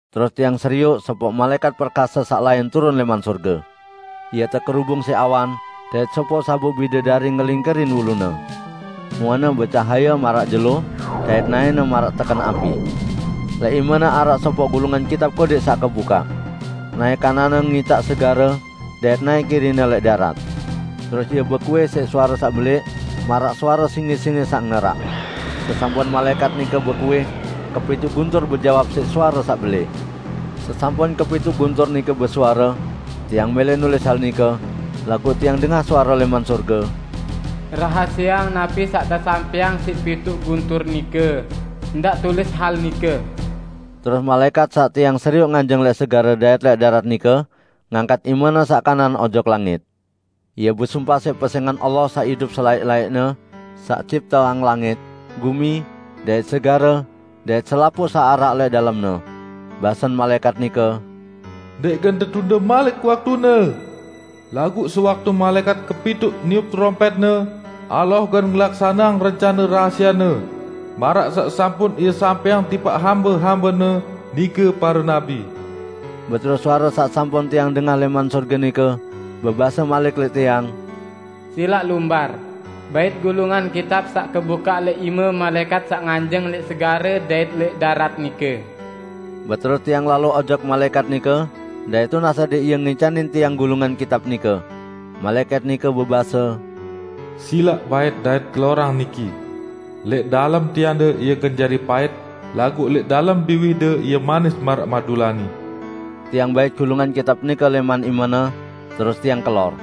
Terus tiang serioq sopoq malaẽkat perkase saq lain turun lẽman sorge. Ie tekerubung siq awan, dait sopoq sabuk bidedari ngelingkerin ulune. Muene becahaye maraq jelo dait naẽne maraq teken api. Lẽq imene araq sopoq gulungan kitab kodẽq saq kebukaq. Naẽ kananne ngicaq segare, dait naẽ kirine lẽq darat. Terus ie bekuih siq suare saq belẽq maraq suare singe-singe saq ngeraq. Sesampun malaẽkat nike bekuih, kepituq guntur bejawab siq suare saq belẽq. Sesampun kepituq guntur nike besuare, tiang mẽlẽ nulis hal nike, laguq tiang dengah suare lẽman sorge, "Rahasieang napi saq tesampẽang siq pituq guntur nike; ndaq tulis hal nike!" Terus malaẽkat saq tiang serioq nganjeng lẽq segare dait lẽq darat nike ngangkat imene saq kanan ojok langit. Ie besumpah siq pesẽngan Allah saq idup selaẽq-laẽqne, saq cipteang langit, gumi dait segare dait selapuq saq araq lẽq dalemne. Basen malaẽkat nike, "Ndẽq gen tetunde malik waktune! Laguq sewaktu malaẽkat kepituq niup terompẽtne, Allah gen ngelaksaneang rencane rahasie-Ne, maraq saq sampun Ie sampẽang tipaq hambe-hambe-Ne, nike pare nabi." Beterus suare saq sampun tiang dengah lẽman sorge nike bebase malik lẽq tiang, "Silaq lumbar bait gulungan kitab saq kebukaq lẽq ime malaẽkat saq nganjeng lẽq segare dait lẽq darat nike." Beterus tiang lalo ojok malaẽkat nike dait tunas adẽq ie ngicanin tiang gulungan kitab nike. Malaẽkat nike bebase, "Silaq bait dait kelorang niki. Lẽq dalem tiande ie gen jari pait, laguq lẽq dalem biwihde ie manis maraq madulani." Tiang bait gulungan kitab nike lẽman imene, terus tiang kelor.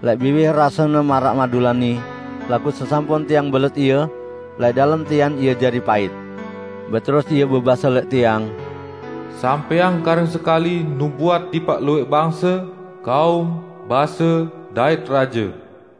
Lẽq biwih rasene maraq madulani, laguq sesampun tiang belet ie, lẽq dalem tian ie jari pait. Beterus ie bebase lẽq tiang, "Sampẽang karing sekali nubuat tipaq luwẽq bangse, kaum, base, dait raje."